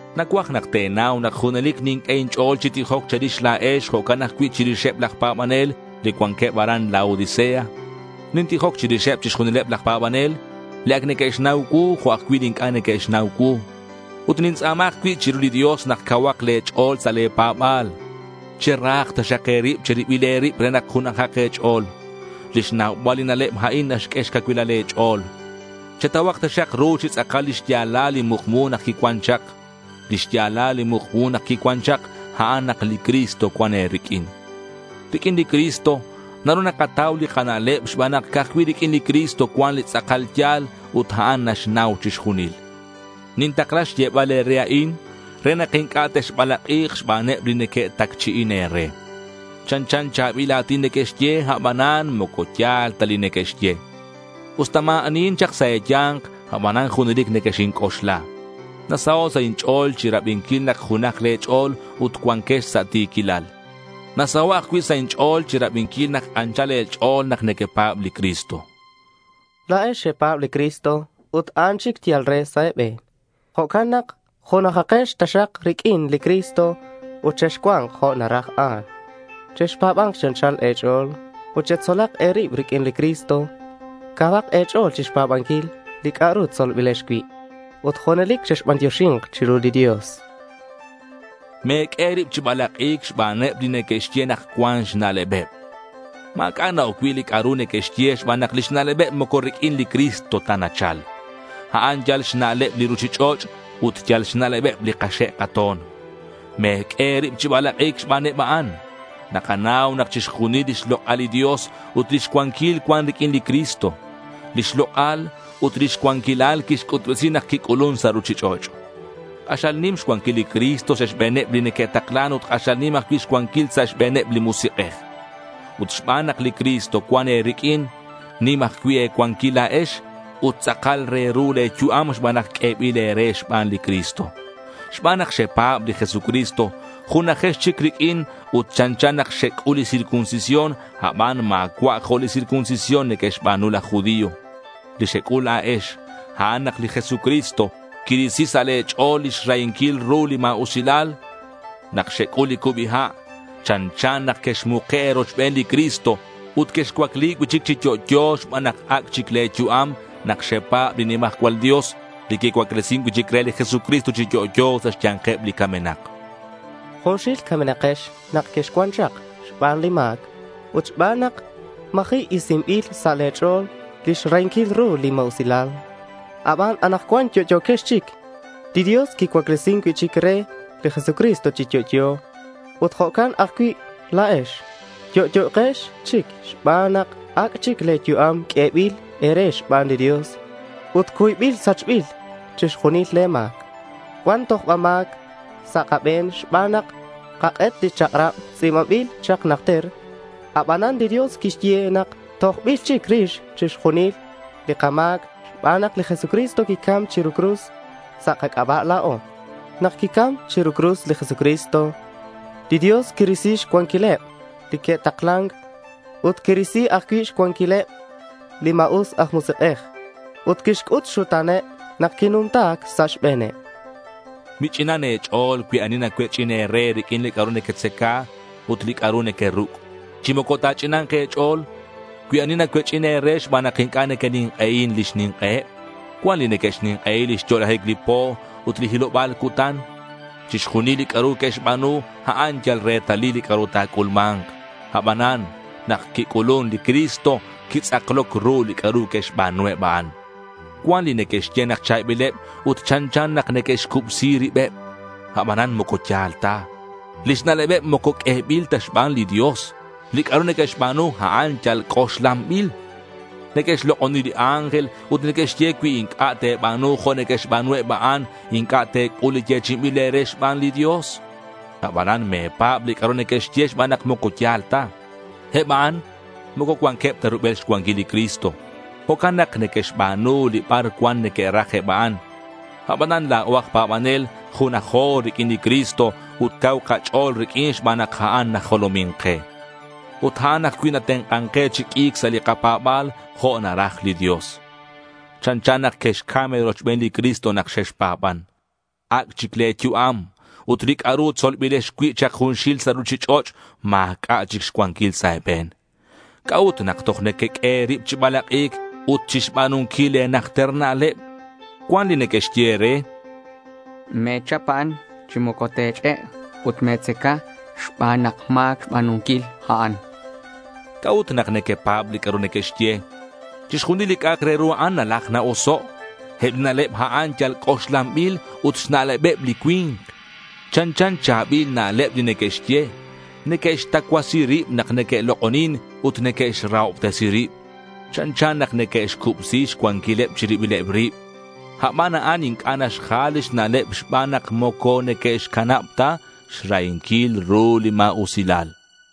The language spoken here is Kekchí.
Nacuaj nak te̱nau nak junelic ninq'ue inch'o̱l chi tijoc che̱rix la̱ex jo'can ajcui' chirixeb laj pa̱banel li cuanqueb aran Laodicea. Nintijoc chirixeb chixjunileb laj pa̱banel, li ac neque'xnau cuu, jo' ajcui' li inc'a' neque'xnau cuu. Ut nintz'a̱ma ajcui' chiru li Dios nak cauhak le̱ ch'o̱l sa' le̱ pa̱ba̱l. Cherahak taxak e̱rib che̱ribil e̱rib re nak junajak e̱ch'o̱l. Lix naubal li na'leb a'in naxq'ue xcacuilal le̱ ch'o̱l. Chetauhak taxak ru chi tz'akal li xya̱lal li mukmu nak quicuan chak. Li xya̱lal li mukmu nak quicuan chak, a'an nak li Cristo cuan e̱riq'uin. Riq'uin li Cristo naru nakatau li kana'leb xban nak ca'aj cui' riq'uin li Cristo cuan li tz'akal ya̱l ut a'an naxnau chixjunil. Nintakla xyebal e̱re a'in re nak inc'a' texbalak'i̱k xbaneb li neque'tacchi'in e̱re. Chanchan cha̱bil a̱tin neque'xye, abanan moco ya̱l ta li neque'xye. Usta ma̱ anihin chak sa' e̱ya̱nk, abanan junelic nequexinc'oxla. Nasaho' sa' inch'o̱l chirabinquil nak junaj le̱ ch'o̱l ut cuanquex sa' ti̱quilal. Nasaho' ajcui' sa' inch'o̱l chirabinquil nak anchal e̱ch'o̱l nak nequepa̱b li Cristo. La̱ex xepa̱b li Cristo ut a'an chic yal re sa' e̱be̱n. Jo'can nak junajakex taxak riq'uin li Cristo, ut texcua̱nk jo' naraj a'an. Chexpa̱ba̱nk chi anchal e̱ch'o̱l ut chetzolak e̱rib riq'uin li Cristo. Cauhak e̱ch'o̱l chixpa̱banquil li c'a'ru tzolbilex cui' ut junelic chexbantioxi̱nk chiru li Dios. Me̱q'ue e̱rib chi balak'i̱c xbaneb li neque'xye nak cuan xna'lebeb. Ma̱c'a' na-oc cui' li c'a'ru neque'xye xban nak lix na'lebeb moco riq'uin li Cristo ta nachal. A'an yal xna'leb li ruchich'och' ut yal xna'lebeb li kaxe' kato̱n. Me̱q'ue e̱rib chi balak'i̱c xbaneb a'an. Nakanau nak chixjunil lix lok'al li Dios ut lix cuanquil cuan riq'uin li Cristo. Lix lok'al ut lix cuanquilal quixc'utbesi nak quic'ulun sa' ruchich'och'. K'axal nim xcuanquil li Cristo sa' xbe̱neb li neque'taklan ut k'axal nim ajcui' xcuanquil sa' xbe̱neb li musik'ej. Ut xban nak li Cristo cuan e̱riq'uin, nim ajcui' e̱cuanquil la̱ex ut tz'akal re ru le̱ yu'am xban nak q'uebil e̱re xban li Cristo. Xban nak xepa̱b li Jesucristo, junajex chic riq'uin ut chanchan nak xec'ul li circuncisión, aban ma̱cua' jo' li circuncisión neque'xba̱nu laj judío. Li xec'ul la̱ex, a'an nak li Jesucristo quirisi sa' le̱ ch'o̱l lix rahinquil ru li ma̱usilal. Nak xec'ul li cubi ha' chanchan nak quexmuke' e̱rochben li Cristo ut quexcuacli cui'chic chi yo'yo xban nak ac' chic le̱ yu'am nak xepa̱b li nimajcual Dios li quicuaclesin cui'chic re li Jesucristo chi yo'yo sa' xya̱nkeb li camenak. Junxil camenakex nak quexcuan chak xban li ma̱c ut xban nak ma̱ji' isinbil sa' le̱ ch'o̱l lix rahinquil ru li ma̱usilal. Aban anakcuan yo'yo̱quex chic. Li Dios quicuaclesin cui'chic re li Jesucristo chi yo'yo. Ut jo'can ajcui' la̱ex, yo'yo̱quex chic xban nak ac' chic le̱ yu'am q'uebil e̱re xban li Dios ut cuybil sachbil chixjunil le̱ ma̱c. Cuan tojba ma̱c sa' kabe̱n xban nak xkak'et li chak'rab tz'i̱banbil chak najter. Abanan li Dios quixye nak tojbil chic rix chixjunil li kama̱c xban nak li Jesucristo quicam chiru li cruz sa' kac'aba' la̱o. Nak quicam chiru li cruz li Jesucristo, li Dios quirisi xcuanquileb li neque'taklan ut quirisi ajcui' xcuanquileb li ma̱us aj musik'ej. Ut quixc'ut xxuta̱neb nak quinumta sa' xbe̱neb. Mich'inan e̱ch'o̱l cui ani nacuech'in e̱re riq'uin li c'a'ru nequetzaca ut li c'a'ru nequeruc'. Chi moco ta̱ch'ina̱nk e̱ch'o̱l cui ani nacuech'in e̱re xban nak inc'a' nequenink'ei lix nink'eheb. Cuan li neque'xnink'ei lix yo'lajic li po ut li hiloba̱l cutan. Chixjunil li c'a'ru que'xba̱nu, a'an yal retalil li c'a'ru ta̱c'ulma̱nk. Abanan, nak quic'ulun li Cristo, quitz'akloc ru li c'a'ru que'xba̱nu eb a'an. Cuan li neque'xye nak cha̱bileb ut chanchan nak neque'xcubsi ribeb. Abanan moco ya̱l ta. Lix na'lebeb moco q'uebil ta xban li Dios. Li c'a'ru neque'xba̱nu, a'an yal c'oxlanbil. Neque'xlok'oni li ángel ut neque'xye cui inc'a' te̱ba̱nu jo' neque'xba̱nu eb a'an, inc'a' te̱c'ul li yechi'inbil e̱re xban li Dios. Abanan me̱pa̱b li c'a'ru neque'xye xban nak moco ya̱l ta. Eb a'an moco cuanqueb ta rubel xcuanquil li Cristo. Jo'can nak neque'xba̱nu li bar cuan neque'raj eb a'an. Abanan la̱o aj pa̱banel, junajo riq'uin li Cristo ut cau kach'o̱l riq'uin xban nak a'an najolomin ke. Ut a'an ajcui' natenk'an ke chi q'ui̱c sa' li kapa̱ba̱l jo' naraj li Dios. Chanchan nak quexcam e̱rochben li Cristo nak xexpa̱ban. Ac' chic le̱ yu'am ut li c'a'ru tzolbilex cui' chak junxil sa' ruchich'och' ma̱c'a' chic xcuanquil sa' e̱be̱n. ¿C'a'ut nak toj nequeq'ue e̱rib chi balak'i̱c ut chixba̱nunquil le̱ najter na'leb? Cuan li neque'xye e̱re: —Me̱chap a'an chi moco te̱ch'e' ut me̱tzaca, xban nak ma̱c xba̱nunquil a'an, chanqueb. ¿C'a'ut nak nequepa̱b li c'a'ru neque'xye? Chixjunil li c'a'ak re ru a'an nalaj na-oso'. Eb li na'leb a'an yal c'oxlanbil ut xna'lebeb li cui̱nk. Chanchan cha̱bil na'leb li neque'xye. Neque'xtacuasi rib nak neque'lok'onin ut neque'xrahobtesi rib. Chanchan nak neque'xcubsi xcuanquileb chi ribileb rib. Aban a'an inc'a' naxjal lix na'leb xban nak moco neque'xcanab ta xrahinquil ru li ma̱usilal.